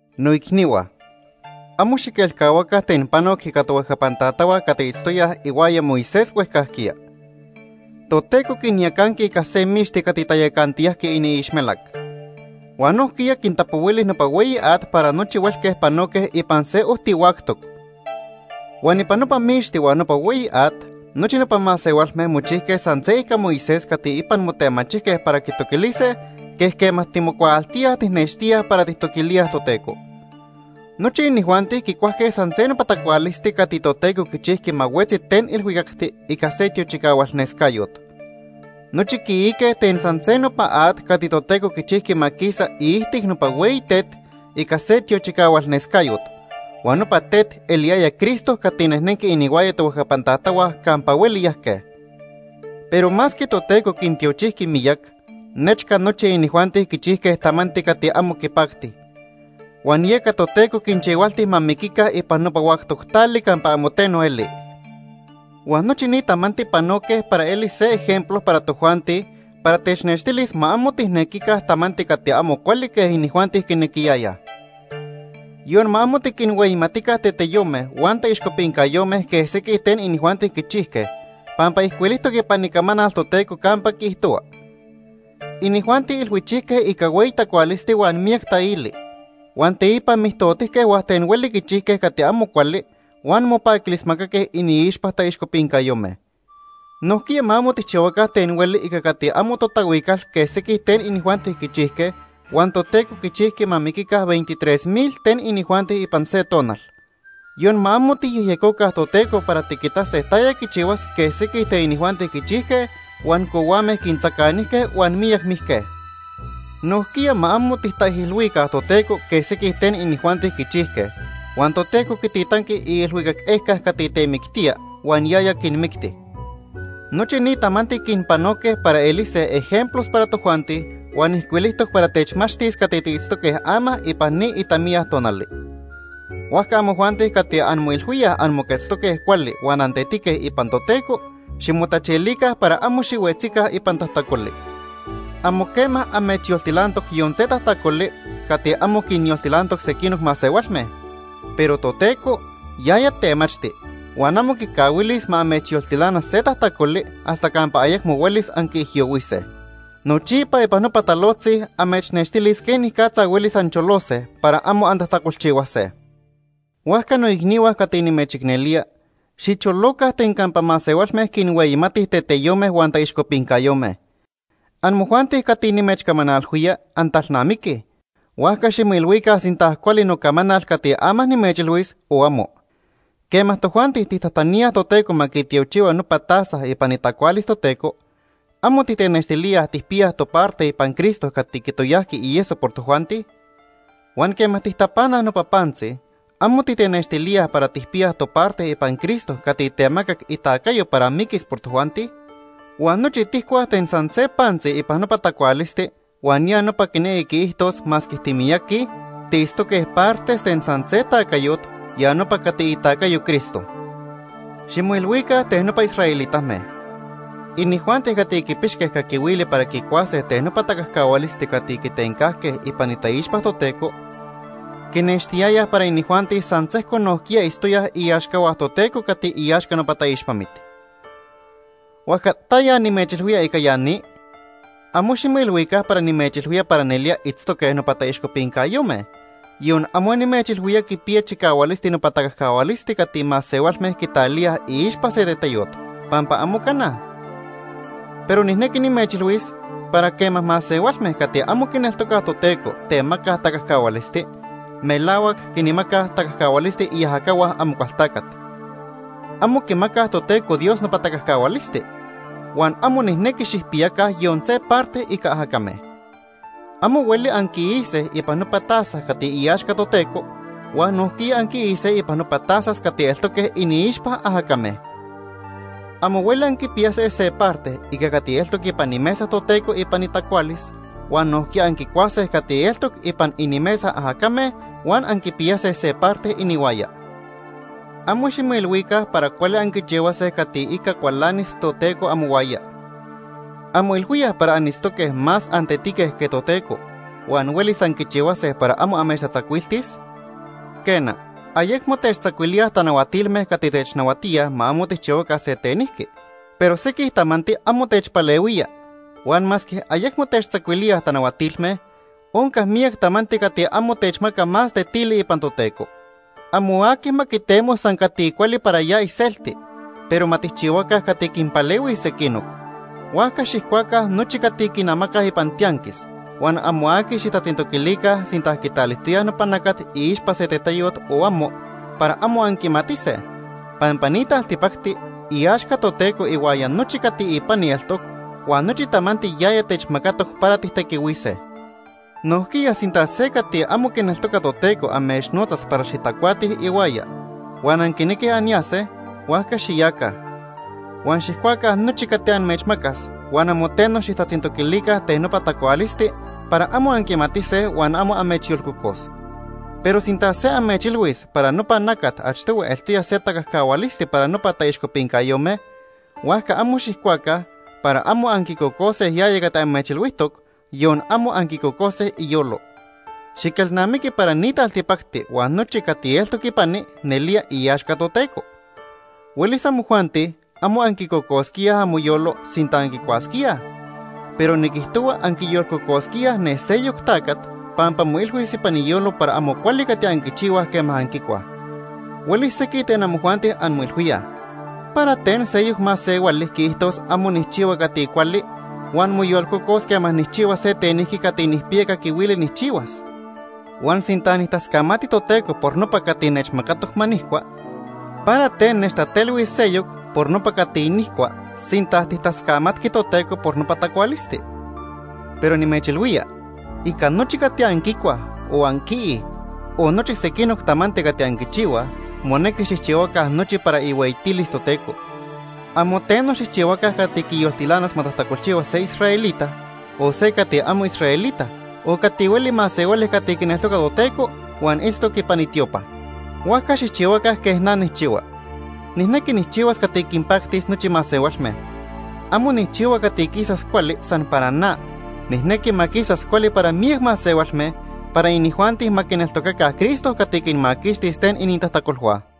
Noicnihua, amo xiquelcahuaca ten panoc ica tohuejcapan tatahua cati itztoyaj ihuaya Moisés huejcajquiya. Toteco quinyacanqui ica se mixti cati tayacantiyajqui iniixmelac. Huan nojquiya quintapohuili nopa hueyi at para nochi huelque panoque ipan se ojti huactoc. Huan ipan nopa mixti huan nopa hueyi at, nochi nopa masehualme mochijque san se ica Moisés cati ipan motemachijque para quitoquilise quej quema timocuaaltíaj tijnextíaj para tijtoquilíaj Toteco. Nochi inijuanti quicuajque san se nopa tacualisti cati Toteco quichijqui ma huetzi ten ilhuicacti ica se tiochicahualnescayot. Nochi quiique ten san se nopa at cati Toteco quichijqui ma quisa iijtic nopa hueyi tet ica se tiochicahualnescayot. Huan nopa tet eliyaya Cristo cati nejnenqui inihuaya tohuejcapan tatahua campa hueli yajque. Pero masque Toteco quintiochijqui miyac, nechca nochi inijuanti quichijque tamanti cati amo quipacti. Huan yeca Toteco quinchihualti ma miquica ipan nopa huactoc tali campa amo teno eli. Huan nochi ni tamanti panoque para elis se ejemplo para tojuanti para technextilis ma amo tijnequica tamanti cati amo cuali quej inijuanti quinequiyayaj. Yon ma amo tiquinhueyimatica teteyome huan taixcopincayome quej sequij ten inijuanti quichijque, pampa ijcuilijtoc ipan Icamanal Toteco campa quiijtohua: “Inijuanti ilhuichijque ica hueyi tacualisti huan miyac taili, huan teipa mijtotijque huan ten hueli quichijque cati amo cuali huan mopaquilismacaque iniixpa taixcopincayome.” Nojquiya ma amo tijchihuaca ten hueli ica cati amo totahuical quej sequij ten inijuanti quichijque huan Toteco quichijqui ma miquica veintitrés mil ten inijuanti ipan se tonal. Yon ma amo tijyejyecoca Toteco para tiquitase taya quichihuas quej sequij ten inijuanti quichijque huan cohuame quintzacanijque huan miyac mijque. Nojquiya ma amo tijtaijilhuica Toteco quej sequij ten inijuanti quichijque huan Toteco quititanqui iilhuicac ejca cati temictía huan yaya quinmicti. Nochi ni tamanti quinpanoque para elise ejemplos para tojuanti huan ijcuilijtoc para techmachtis cati tiitztoque ama ipan ni itamiya tonali. Huajca amojuanti cati anmoilhuíaj anmoquetztoque cuali huan antetique ipan Toteco, ximotachilica para amo xihuetzica ipan tajtacoli. Amo quema amechyoltilantoc yon se tajtacoli cati amo quinyoltilantoc sequinoc masehualme. Pero Toteco, yaya temachti, huan amo quicahuilis ma amechyoltilana se tajtacoli hasta campa ayecmo huelis anquiijyohuise. Nochipa ipan nopa talojtzi amechnextilis quenicatza huelis ancholose para amo antajtacolchihuase. Huajca noicnihua cati nimechicnelía, xicholoca ten campa masehualme quinhueyimatij teteyome huan taixcopincayome. Amojuanti cati nimechcamanalhuía, antalnamiquij, huajca ximoilhuica sinta cuali nocamanal cati ama nimechilhuis o amo. Quema tojuanti tijtajtaníaj Toteco ma quitiochihua nopa taza ipan itacualis Toteco, ¿amo titenextilíaj tijpiyaj toparte ipan Cristo cati quitoyajqui ieso por tojuanti? Huan quema tijtapanaj nopa pantzi, ¿amo titenextilíaj para tijpiyaj toparte ipan Cristo cati temacac itacayo para miquis por tojuanti? Huan nochi tijcuaj ten san se pantzi ipan nopa tacualisti huan ya nopa quinequi quiijtos masque timiyaqui, tiitztoque partes ten san se tacayot, ya nopa cati itacayo Cristo. Ximoilhuica ten nopa israelitame. Inijuanti cati quipixque caquihuili para quicuase ten nopa tacajcahualisti cati quitencajque ipan itaixpa Toteco, quinextiyayaj para inijuanti san sejco nojquiya itztoyaj iaxcahua Toteco cati iaxca nopa taixpamit. ¿Huajca taya nimechilhuía ica ya ni? Amo ximoilhuica para nimechilhuía para nelía itztoque nopa taixcopincayome, yon amo nimechilhuía quipiya chicahualisti nopa tacajcahualisti cati masehualme quitalíaj iixpa se teteyot, pampa amo cana. Pero nijnequi nimechilhuis para quema masehualme cati amo quineltocaj Toteco temacaj tacajcahualisti, melahuac quinmacaj tacajcahualisti iajacahua Amocualtacat. Amo quimacaj Toteco Dios nopa tacajcahualisti. Huan amo nijnequi xijpiyaca yon se parte ica ajacame. Amo hueli anquiise ipan nopa taza cati iaxca Toteco huan nojquiya anquiise ipan nopa tazas cati eltoque iniixpa ajacame. Amo hueli anquipiyase se parte ica cati eltoc ipan imesa Toteco ipan itacualis huan nojquiya anquicuase cati eltoc ipan inimesa ajacame huan anquipiyase se parte inihuaya. Amo ximoilhuica para cuali anquichihuase cati ica cualanis Toteco amohuaya. ¿Anmoilhuíaj para anitztoque más antetique que Toteco huan huelis anquichihuase para amo amechtatzacuiltis? Quena, ayecmo techtzacuilíaj tanahuatilme cati technahuatíaj ma amo tijchihuaca se tenijqui, pero sequij tamanti amo techpalehuía. Huan masque ayecmo techtzacuilíaj tanahuatilme, onca miyac tamanti cati amo techmaca más tetili ipan Toteco. Amo aqui ma quitemo san cati cuali para ya iselti, pero ma tijchihuaca cati quinpalehuis sequinoc. Huajca xijcuaca nochi cati quinamacaj ipan tianquis huan amo aqui xijtatzintoquilica sinta quitalijtoyaj nopa nacat iixpa se teteyot o amo, para amo anquimatise, pampa ni taltipacti iaxca Toteco ihuaya nochi cati ipani eltoc huan nochi tamanti yaya techmacatoc para tijtequihuise. Nojquiya sinta se cati amo quineltoca Toteco amechnotzas para xitacuatij ihuaya huan anquinequij anyase, huajca xiyaca. Huan xijcuaca nochi cati amechmacas huan amo teno xijtatzintoquilica ten nopa tacualisti para amo anquimatise huan amo amechyolcocos. Pero sinta se amechilhuis para nopa nacat achtohui eltoya se tacajcahualisti para nopa taixcopincayome, huajca amo xijcuaca para amo anquicocose yaya cati amechilhuijtoc, yon amo anquicocose iyolo. Xiquelnamiqui para ni taltipacti huan nochi cati eltoc ipani nelía iaxca Toteco. Huelis amojuanti amo anquicocosquíaj amoyolo sinta anquicuasquíaj, pero niquijtohua anquiyolcocosquíaj ne seyoc tacat pampa moilhuis ipan iyolo para amo cuali cati anquichihuaj quema anquicuaj. Huelis sequij ten amojuanti anmoilhuíaj: “¿Para ten seyoc masehuali quiijtos amo nijchihua cati cuali huan moyolcocos quema nijchihua se tenijqui cati nijpiya caquihuili nijchihuas? Huan sinta nijtascamati Toteco por nopa cati nechmacatoc ma nijcua, ¿para ten nechtatelhuis seyoc por nopa cati nijcua, sinta tijtascamatqui Toteco por nopa tacualisti?” Pero nimechilhuía, ica nochi cati anquicuaj, o anquiij, o nochi sequinoc tamanti cati anquichihuaj, monequi xijchihuaca nochi para ihueyitilis Toteco. Amo teno xijchihuaca cati quiyoltilanas ma tajtacolchihua se israelita, o se cati amo israelita, o cati hueli masehuali cati quineltoca Toteco huan itztoc ipan itiopa. Huajca xijchihuaca quej na nijchihua. Nijnequi nijchihuas cati quinpactis nochi masehualme. Amo nijchihua cati quisas cuali san para na. Nijnequi ma quisas cuali para miyac masehualme para inijuanti ma quineltocaca Cristo cati quinmaquixtis ten inintajtacolhua.